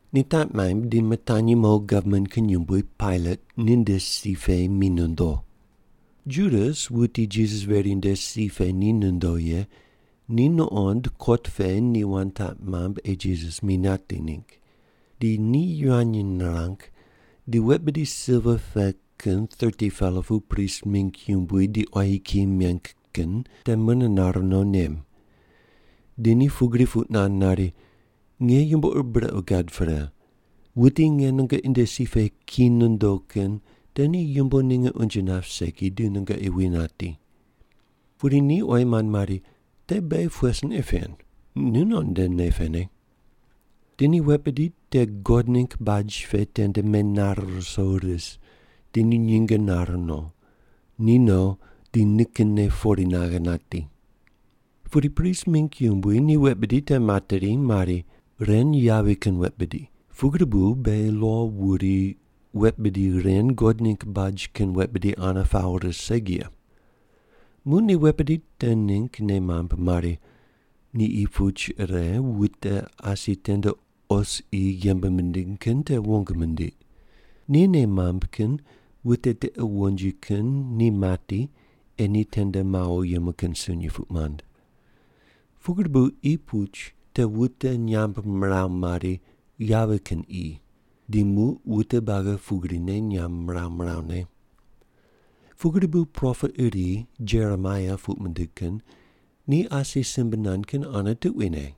Ni taq maimb di mitanyi mo gavman kin yumbui, Pailat, ninde si pe mi nondo. Judas, wuti Jisas veri nde si pe ni nondo ye, ni nuqond kot pe ni wand taq mamb ei Jisas mi nati ningg. Di ni yivany nirang di wet bidi silva pe kin 30-pela pu prist mingg yumbui di quayi kiyi meng kin te mune nare no nem. Di ni pugri puq nand nari, “Nge yumbo ur brequ gad pre. Wuti nge nungoqi nde si pe ki nondo kin te ni yumbo ninge unje nap segi di nungoqi wi nati.” Pudi ni oyi mand mari, “Te beghi pughe sin ei pen? Nu non nde nei pene.” Di ni wet bidi te God ningg baj pe tende menare ruso ris, di ni nyinge nare no. Ni no, di nikinne pori naghe nati. Pudi prist mingg yumbui ni wet bidi te materi mari, “Ren yavi kin wet bidi, pugri bu beghi lo wuri wet bidi ren God ningg baj kin wet bidi ane pawo ris segi ye.” Muq ni wet bidi te ningg nei mamb mari, ni qi puch ire wute asi tende os qi yembe mindiny kin te wong mindiq. Ni nei mamb kin wute tiqe wonji kin ni mati ei ni tende mawo yemu kin sunyi puq mand. Pugri bu qi puch te wute nyamb miraw mari, “Yavi kin qi,” di muq wute buagi pugrine nyamb miraw mirawne. Pugri bu propet iri, Jeremaia puq mindig kin, ni asi simbe nand kin ane tuquine.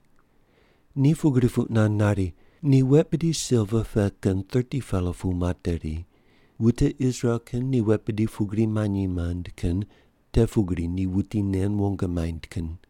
Ni pugri puq nand nari, “Ni wet bidi silva pe kin 30-pela pu materi. Wute Israel kin ni wet bidi pugri manyi mand kin te pugri ni wuti nen wong maind kin.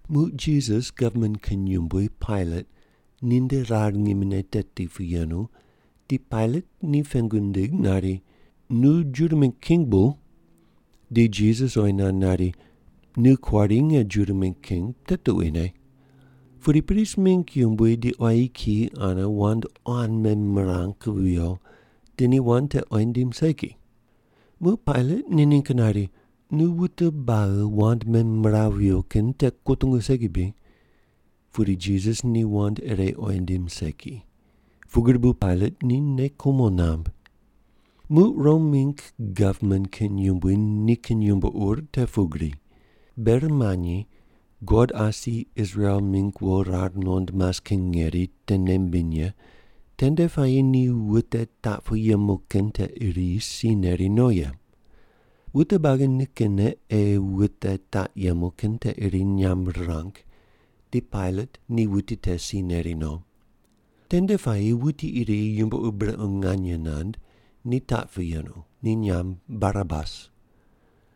Muq Jisas gavman kin yumbui, Pailat, ninde rar ngimine teti pu yenu di Pailat ni pengu nindig nari, “Nu Juda mingg king bu?” Di Jisas oyi nand nari, “Nu kuari nge Juda mingg king, te tuquine.” Pudi prist mingg yumbui di quayi kiyi ane wand quan memirang viyo, di ni wand te oyi nindim segi. Muq Pailat ni ningg nari, “Nu wute buagi wand memiraw viyo kin te kutungu segi bri?” Pudi Jisas ni wand ire oyi nindim segi, pugri bu Pailat ni nei kumo namb. Muq Rom mingg gavman kin yumbui nikin yumbo ur te pugri: Ber manyi God asi Israel mingg wo rar nuqond mas kin ngeri te nei mimbiny ye tende puayi ni wute taq pu yemu kin te iri si neri no ye. Wute buagi nikinne ei wute taq yemu kin te iri nyamb rirang, di Pailat ni wuti te si neri no. Tende puayi wuti iri yumbo ur brequ nganye nand ni taq pu yenu, ni nyamb Barabas.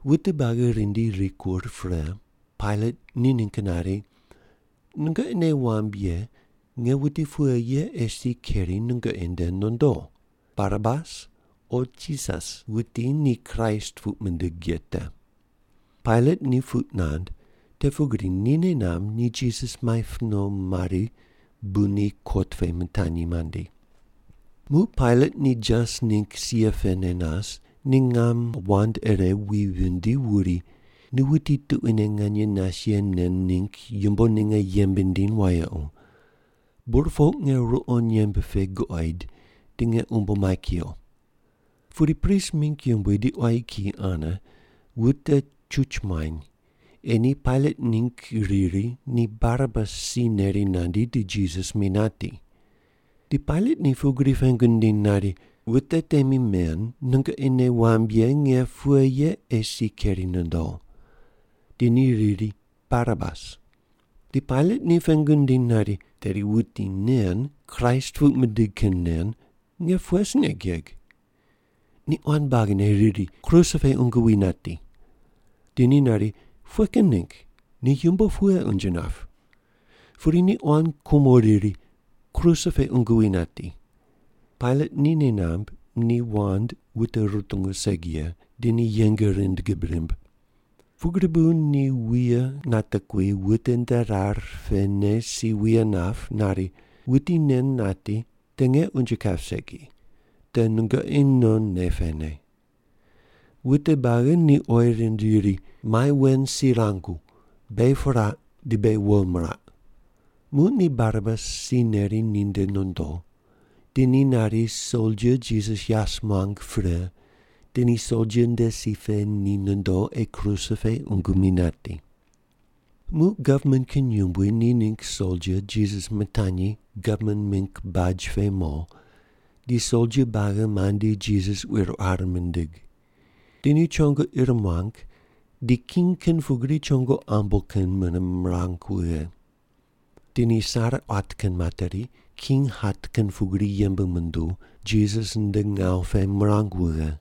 Wute buagi rindi rikur pre, Pailat ni ningg nari, “Nungoqi nei wamb ye nge wuti pughe ye ei si keri nungoqi nde nondo, Barabas o Jisas, wuti ni Kraist pug mindig ye te?” Pailat ni puq nand, te pugri ni nei namb ni Jisas maip no mari bu ni kot pe mitanyi mandi. Muq Pailat ni jas ningg sia pene nas, ni ngam wand ire wi vindi wuri, “Nu wuti tuquine nganye nas ye nen ningg yumbo ninge yembe ndiny wayequ. Burpoq nge ruqo nyemb pe guqoid, di nge umbo mai kuyo.” Pudi prist mingg yumbui di quayi kiyi ane wute chuch muany, ei ni Pailat ningg riri ni Barabas si neri nandi di Jisas mi nati. Di Pailat ni pugri pengu nindiny nari, “Wute temi men, nungoqi nei wamb ye nge pughe ye ei si keri nondo?” Di ni riri, “Barabas.” Di Pailat ni pengu nindiny nari, “Tedi wuti nen, Kraist puq mindig kin nen, nge pughe sin ei geg?” Ni quan buagine riri, “Kruse pe qungu wi nati.” Di ni nari, “Pughe kin ningg, ni yumbo pughe unje nap?” Pudi ni quan kumo riri, “Kruse pe qungu wi nati.” Pailat ni nei namb ni wand wute rutungu segi ye, di ni yeng rind gib rimb. Pugri bu ni wuye natekui wute nde rar pene si wuye nap, nari, “Wuti nen nati, te nge unje kap segi, te nungoqi non nei pene.” Wute buagi ni oyi rind riri, “Mai wen si rangu, beghi piraq di beghi wo miraq!” Muq ni Barabas si neri ninde nondo. Di ni nari soldia Jisas yas muang pre, di ni soldia nde si pe ni nondo ei kruse pe qungu mi nati. Muq gavman kin yumbui ni ningg soldia Jisas mitanyi gavman mingg baj pe mo di soldia buagi mandi Jisas quir quar mindig. Di ni chongo ir muang di king kin pugri chongo ambo kin mune mirang wughe. Di ni sare quat kin materi, king hat kin pugri yembe munduw, Jisas nde ngawu pe mirang wughe.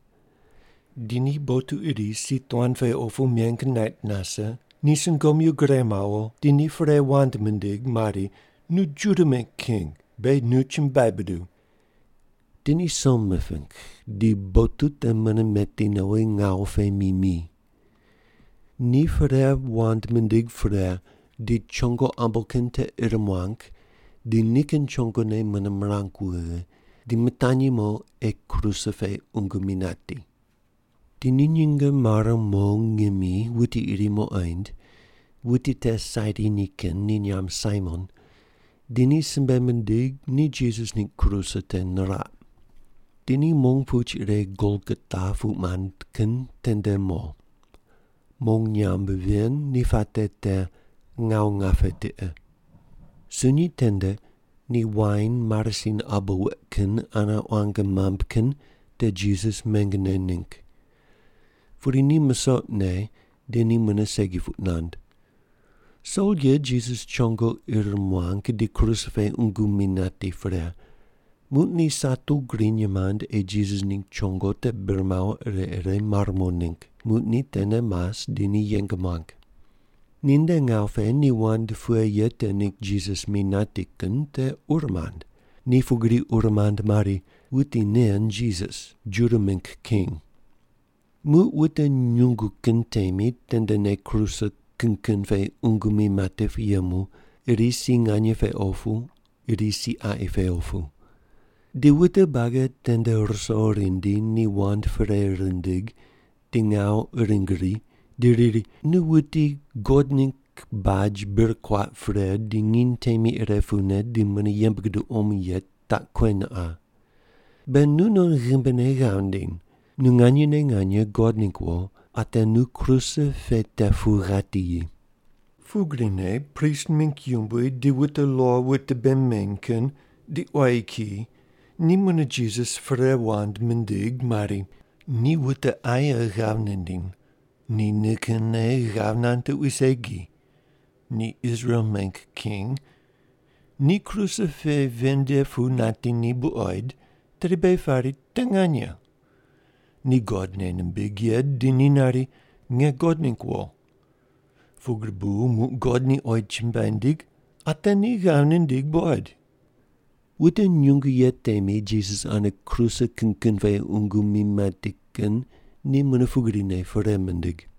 Di ni botu iri si tuan pe opu meng nait nase, ni sungomyu gure mawo, di ni perei wand mindig mari, “Nu Juda mingg king, beghi nu chumbuai buduw.” Di ni som miping, di botu te mune meti nowi ngawu pe mi mi. Ni perei wand mindig pre, di chongo ambo kin te ir muang di nikin chongone mune mirang wughe, di mitanyi mo ei kruse pe qungu mi nati. Di ni nyinge mare mo ngimi wuti iri muqoind, wuti te Sairini kin ni nyamb Saimon, di ni simbe mindig ni Jisas ningg kruse te niraq. Di ni mong puch ire Golgota puq mand kin tende mo. (Mong nyamb ven ni puate te, “ngawu ngape tiqe.”) Sunyi tende ni wain marasin abo weq kin ane quang mamb kin te Jisas meng ne ningg. Pudi ni musoq ne, di ni mune segi puq nand. Soldia Jisas chongo ir muang di kruse pe qungu mi nati pre, muq ni satu griny mand ei Jisas ningg chongo te bir mawo ire ire mare mo ningg, muq ni tene mas di ni yeng muang. Ninde ngawu pe ni wand pughe ye te ningg Jisas mi nati kin te ur mand. Ni pugri ur mand mari, “Wuti nen Jisas, Juda mingg king.” Muq wute nyungu kin temi tendene kruse kin kin pe qungu mi mati pu yemu, iri si nganye pe opu, iri si qaqi pe opu. Di wute buagi tende ruso rindi, ni wand perei rindig di ngawu uring ri, di riri, “Nu wuti God ningg baj bir kuaq pre di nginy temi ire pune di mune yembe guduw omo ye taq kuen qa. Be nu non ghimbine ghav ndiny. Nu nganyene nganye God ningg wo, ate nu kruse pe te pu ghati yi.” Pugrine prist mingg yumbui di wute lo wute bei meny kin di quayi kiyi ni mune Jisas perei wand mindig mari, “Ni wute aye ghav nindiny. Ni nikinne ghav nand tuqui segi. Ni Israel mingg king. Ni kruse pe ven nde pu nati ni buqoid, tedi beghi pari te nganye. Ni God nei nimbig ye di ni nari, ‘Nge God ningg wo.’ Pugri bu muq God ni oyi chumbuai nindig, ate ni ghav nindig buqoid.” Wute nyungu ye temi Jisas ane kruse kin kin pe qungu mi mati kin ni mune pugrine perei mindig.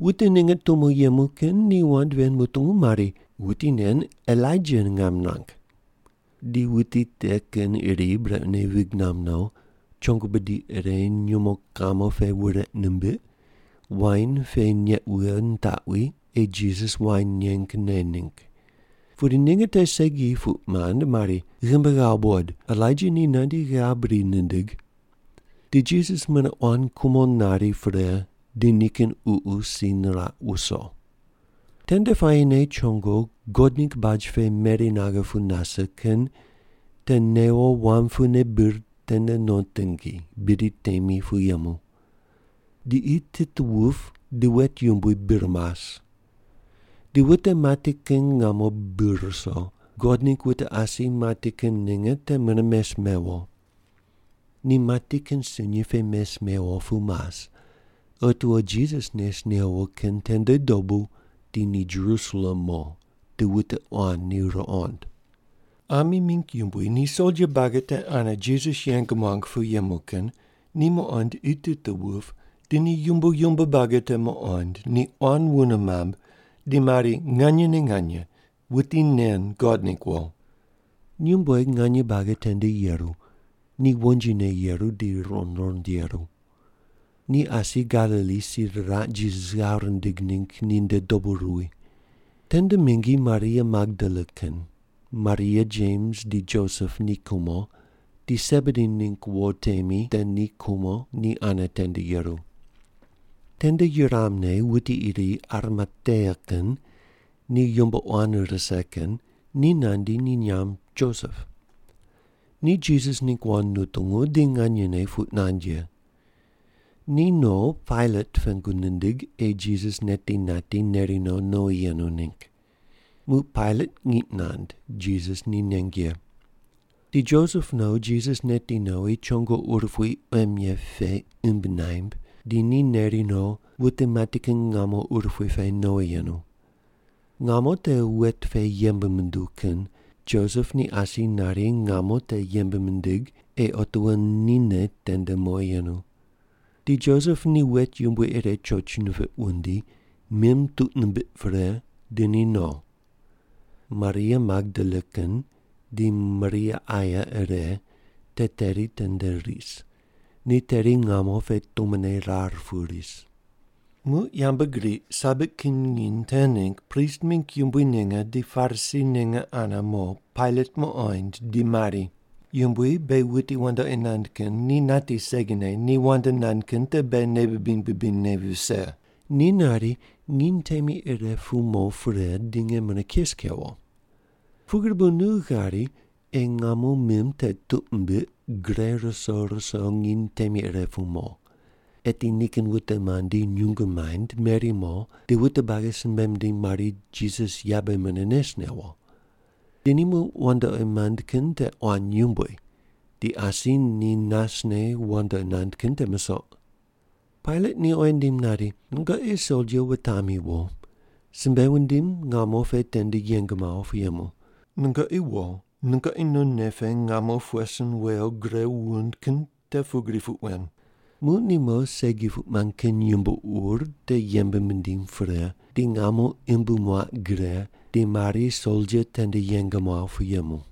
Wute ninge tumo yemu kin ni wand ven mutungu mari, “Wuti nen Elaija ngam nirang.” Di wuti te kin iri brequne vig namb no, chongo bidi ire nyumo kamo pe wureq nimbiq, wain pe neq wughe nitaqwi, ei Jisas wain neng, ne ningg. Pudi ninge te segi puq mand mari, “Ghimbi ghawo buqod, Elaija ni nandi ghav bri nindig.” Di Jisas mune quan kumo nari pre, di nikin ququ si niraq wuso. Tende puayine chongo God ningg baj pe meri naghe pu nase kin te newo wam pune bir tene no tingi, bidi temi pu yemu. Di qi tit wup di wet yumbui bir mas. Di wute mati kin ngamo bi ruso, God ningg wute asi mati kin ninge te mune mes mewo. Ni mati kin sunyi pe mes mewo pu mas, otiwo Jisas nes newo kin tende dobu di ni Jerusalem mo, di wute quan ni ruqond. Ami mingg yumbui ni soldia buagi te ane Jisas yeng muang pu yemu kin, ni muqond qi tit wup di ni yumbo yumbo buagi te muqond ni quan wune mamb di mari, “Nganyene nganye, wuti nen God ningg wo.” Nyumbueg nganye buagi tende yeru, ni wonjine yeru di ruqond ruqond yeru. Ni asi Galili si riraq Jisas ghav rindig ningg ni nde dobu ruwi. Tende mingi Maria Magdala kin, Maria Jems di Josep ni kumo, di Sebedi ningg wo temi te ni kumo ni ane tende yeru. Tende yuramne wuti iri Arimatea kin, ni yumbo quan rise kin, ni nandi, ni nyamb Josep. Ni Jisas ningg wand nutungu di nganyene puq nand ye. Ni no Pailat pengu nindig ei Jisas neti nati, neri no nowi yenu ningg. Muq Pailat ngiq nand, Jisas ni neng ye. Di Josep no, Jisas neti nowi, chongo urupui quem ye pe imb naimb, di ni neri no, wute mati kin ngamo urupui pe nowi yenu. Ngamo te wet pe yembe munduw kin, Josep ni asi nari ngamo te yembe mindig, ei otiwo nine tende mowi yenu. Di Josep ni wet yumbui ire choch nipiq wundi, mim tuq nimbiq pre, di ni no. Maria Magdala kin di Maria aye ire te teri tende ris. Ni teri ngamo pe tumone rar pu ris. Muq yambgriq Sabat kin nginy te ningg prist mingg yumbui ninge di Parisi ninge ane mo Pailat muqoind, di mari, “Yumbui, beghi wuti wandoqi nand kin ni nati segine ni wand nand kin te beghi nei bibiny bibinyne vise. Ni nari, ‘Nginy temi ire pu mo pre di nge mune kes kewo.’ Pugri bu nu ghari ei ngamo mim te tuq mimbiq gre ruso ruso nginy temi ire pu mo. Eti nikin wute mandi nyungu maind meri mo, di wute buagi simbe mindiny mari, ‘Jisas yabe mune nes newo.’ Di ni muq wandoqi mand kin te quan yumbui, di asi ni nasne wandoqi nand kin te musoq.” Pailat ni oyi nindim nari, “Nungoqi soldia wutami wo, simbe wundim ngamo pe tende yeng mawo pu yemu. Nungoqi wo, nungoqi non nei pe ngamo pughe sin wew gre wund kin te pugri puq wen.” Muq ni mo segi puq mand kin yumbo ur te yembe mindiny pre, di ngamo imb muaq gre di mari soldia tende yeng muaw pu yemu.